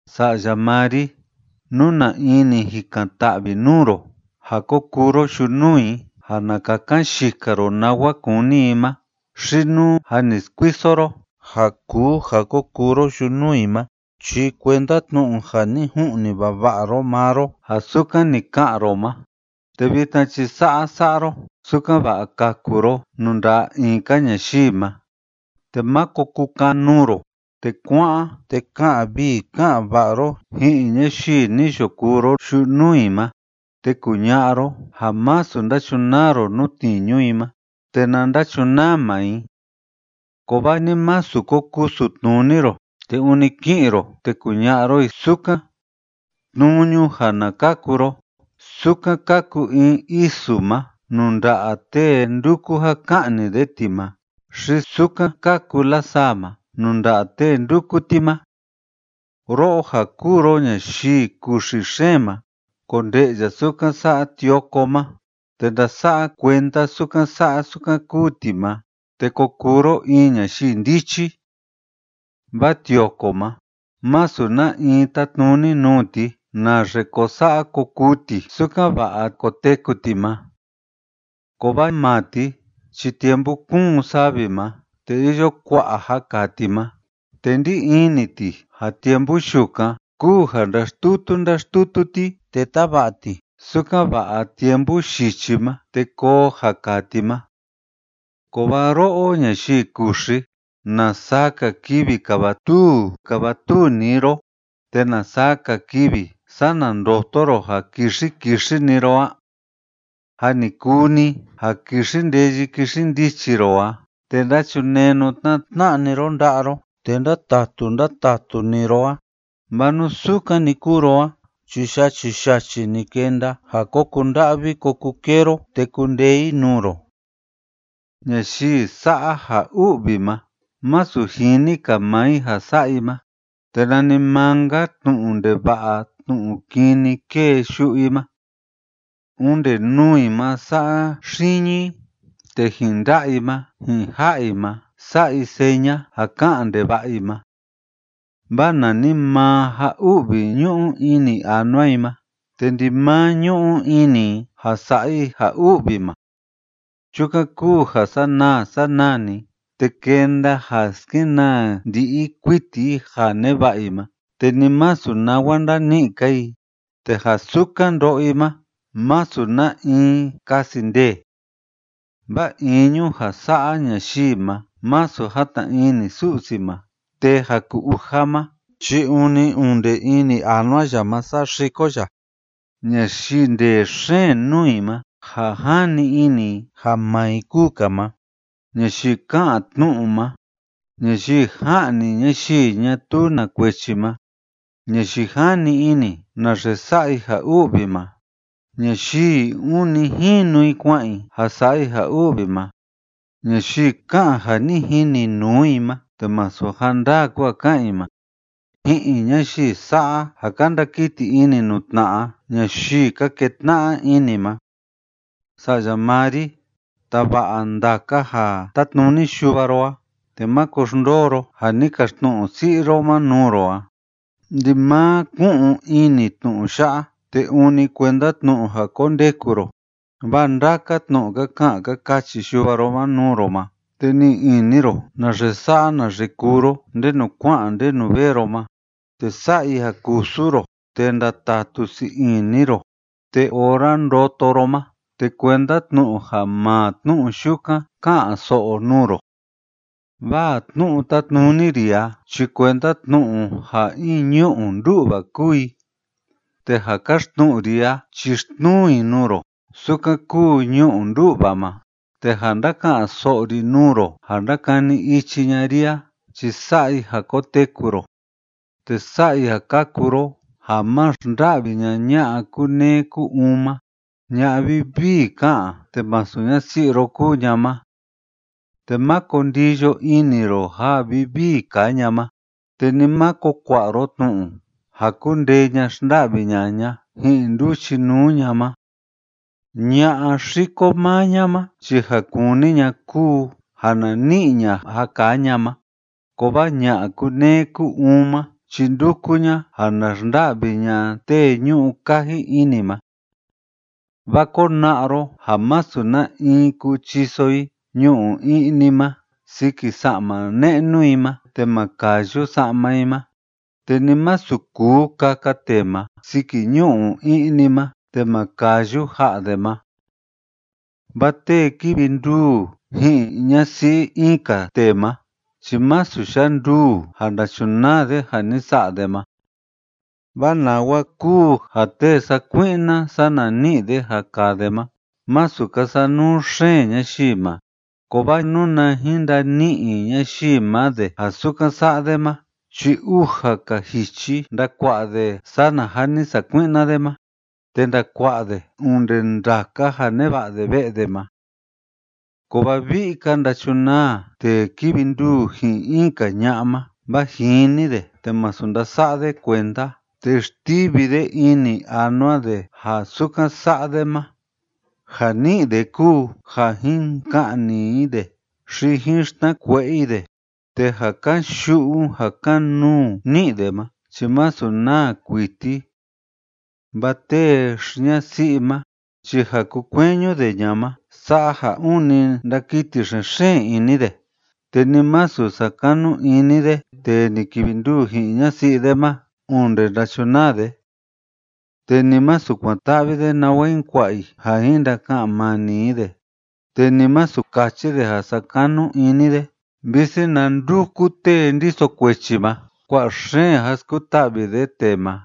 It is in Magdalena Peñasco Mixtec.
Sa'ya maa ri, nú na in ni jikan‑ta'vi nuu ro ja ko kuu ro yunuu i ja na kakan yika ro nawa kúni i ma xi nú jâ ni skuiso ro ja kuu ja ko kuu ro yunuu i ma, chi kuenda tnu'u ja ni ju'ni vava'a ro maa ro ja sukan ni ka'an ro ma, te vitna chi sa'a sa'a ro, sukan‑va'a kaku ro nuu nda'a in‑ka ñayii ma, te máko kukan‑nuu ro, te kua'an te ka'an vii ka'an va'a ro ji'in ñayii ni yo kuu ro yunuu i ma, te kuña'a ro ja masu ndachunaa ro nuu tniñu i ma te na ndachunaa maa i. Kovaa ni másu ko kusu tnuni ro, te ûni ki'in ro te kuña'a ro i sukan. Tnuñu ja na kaku ro sukan kaku in isu ma nuu nda'a tee nduku ja ka'ni de ti ma, xi sukan kaku lasaa ma nuu nda'a tee ndúku ti ma. Ro'o ja kuu ro ñayii kuxi xeen ma, konde'ya sukan sa'a tioko ma, te ndasa'a kuenda sukan sa'a sukan kúu ti ma, te ko kuu ro in ñayii ndichi. Vaa tioko ma, masu na in tátnuni nuu ti naxe ko sa'a ko kuu ti sukan‑va'a koteku ti ma. Kovaa maa ti chi tiempu kúun savi ma te iyo kua'a ja kaa ti ma te ndí ini ti ja tiempu yukan kúu ja ndáxtutu ndáxtutu ti te táva'a ti sukan‑va'a tiempu yichi ma te koo ja kaa ti ma. Kovaa ro'o ñayii kuxi, ¿na saa‑ka kivi kavatuu kavatuu‑ni ro, te na saa‑ka kivi sana ndoto ro ja kixi kixi‑ni ro a? Jâ ni kuu‑ni ja kixi ndeyi kixi ndichi ro a te ndachunenu tna'a tna'a‑ni ro nda'a ro te ndatatu ndatatu‑ni ro a. Vaa nú sukan‑ni kúu ro a chi yachi yachi‑ni kenda ja ko kunda'vi ko kukee ro te kundee i nuu ro. Ñayii sa'a ja u'vi ma masu jini‑ka maa i ja sa'a i ma, te nanimaa‑nka tnu'u ndeva'a tnu'u kini kée yu'u i ma. Onde nuu i ma sa'a xiñi i, te ji'in nda'a i ma ji'in ja'a i ma sa'a i seña ja ká'an ndeva'a i ma. Vaa nanimaa ja u'vi ñu'u ini anua i ma, te ndimaa ñu'u ini i ja sa'a i ja u'vi ma. Chukan kúu ja sanaa sanaa‑ni, te kenda ja skenaa ndi'i kuiti i ja neva'a i ma, te ni masu nawa ndani'i‑ka i, te ja sukan ndo'o i ma, masu na in kasi ndee. Vaa iñu ja sa'a ñayii ma masu jatna ini Su'si ma, te ja ku‑uja ma chi ûni onde ini anua ya ma saxiko ya. Ñayii ndee xeen nuu i ma ja jani ini i ja maa i kúu‑ka ma, ñayii ka'an tnu'u ma, ñayii ja'ni ñayii ñatuu na kuechi ma, ñayii jani ini naxe sa'a i ja u'vi ma, ñayii ûni jinu i kua'an i ja sa'a i ja u'vi ma, ñayii ka'an ja ni jini nuu i ma te masu ja ndaa kúu ja ká'an i ma, ji'in ñayii sa'a ja ka ndakiti ini nuu tna'a ñayii ka ketna'a ini ma. Sa'ya maa ri, tava'a ndaka ja tátnuni yuva ro a, te máko xndoo ro ja ni kaxtnu'u si'i ro ma nuu ro a. Ndimaa ku'un ini tnu'u ya'a te ûni kuenda tnu'u ja kondeku ro, vaa ndaka tnu'u ka ka'an ka kachi yuva ro ma nuu ro ma, te ni'i ini ro naxe sa'a naxe kuu ro ndenu kua'an ndenu vee ro ma, te sa'a i ja kusu ro te ndatatu sii ini ro, te ora ndoto ro ma te kuenda tnu'u ja maa tnu'u yukan ká'an‑so'o nuu ro. Vaa tnu'u tátnuni ri a chi kuenda tnu'u ja in ñu'u ndú'va kúu i, te ja káxtnu'u ri a chi xtnuu i nuu ro sukan kúu ñu'u ndú'va ma, te ja ndáka'an‑so'o ri nuu ro ja ndákani ichi ña'a ri a chi sa'a i ja koteku ro, te sa'a i ja kaku ro ja ma xnda'vi ña'a ña'a kúneé kú‑uun ma ña'a vivii ká'an te masu ñasi'i ro kúu ña ma. Te máko ndiyo ini ro ja vivii kaa ña ma, te ni máko kua'a ro tnu'u ja kundee ña xnda'vi ña'a ña ji'in nduchinuu ña ma. Ña'a xiko maa ña ma chi ja kúni ña kúu ja na ni'i ña ja kaa ña ma, kovaa ña'a kúneé kú‑uun ma chi ndúku ña ja na xnda'vi ña tee ñu'u kaji ini ma. Vaa kona'a ro ja masu na‑in kuu chiso i ñu'u i'ni ma siki sa'ma ne'nu i ma te ma kayu sa'ma i ma, te ni masu kuu kaka tee ma siki ñu'u i'ni ma te ma kayu ja'a de ma. Vaa tee kívi nduu ji'in ñasi'i in‑ka tee ma chi másu yanduu ja ndachunaa de ja ni sa'a de ma. Vaa nawa kúu ja tee sakui'na sana ni'i de ja kaa de ma masu ka sanuu xeen ñayii ma. Kovaa nuna jin ndani'i ñayii ma de ja sukan sa'a de ma chi uja‑ka jichi ndakua'a de sana ja ni sakui'na de ma, te ndakua'a de onde ndaka ja neva'a de ve'e de ma. Kovaa vi'i‑ka ndachunaa tee kívi nduu ji'in in‑ka ña'a ma, vaa jini de te masu ndasa'a de kuenda, te xtivi de ini anua de ja sukan sa'a de ma. Ja ni'i de kúu ja jin ka'ni i de xi jin xtnakue'e i de, te ja kan‑yu'u ja kan‑nuu ni'i de ma chi masu naa kuiti. Vaa tee xi‑ñasi'i ma chi ja kukueñu de ña ma sa'a ja ûni ndakiti xen‑xeen ini de, te ni masu sakanu ini de tee ni kivi nduu ji'in ñasi'i de ma onde ndachunaa de. Te ni masu kuan‑ta'vi de nawa jin kua'a i ja jin ndaka'an mani i de, te ni masu kachi de ja sakanu ini de, visi na nduku tee ndiso kuechi ma kua'a xeen ja skuta'vi de tee ma.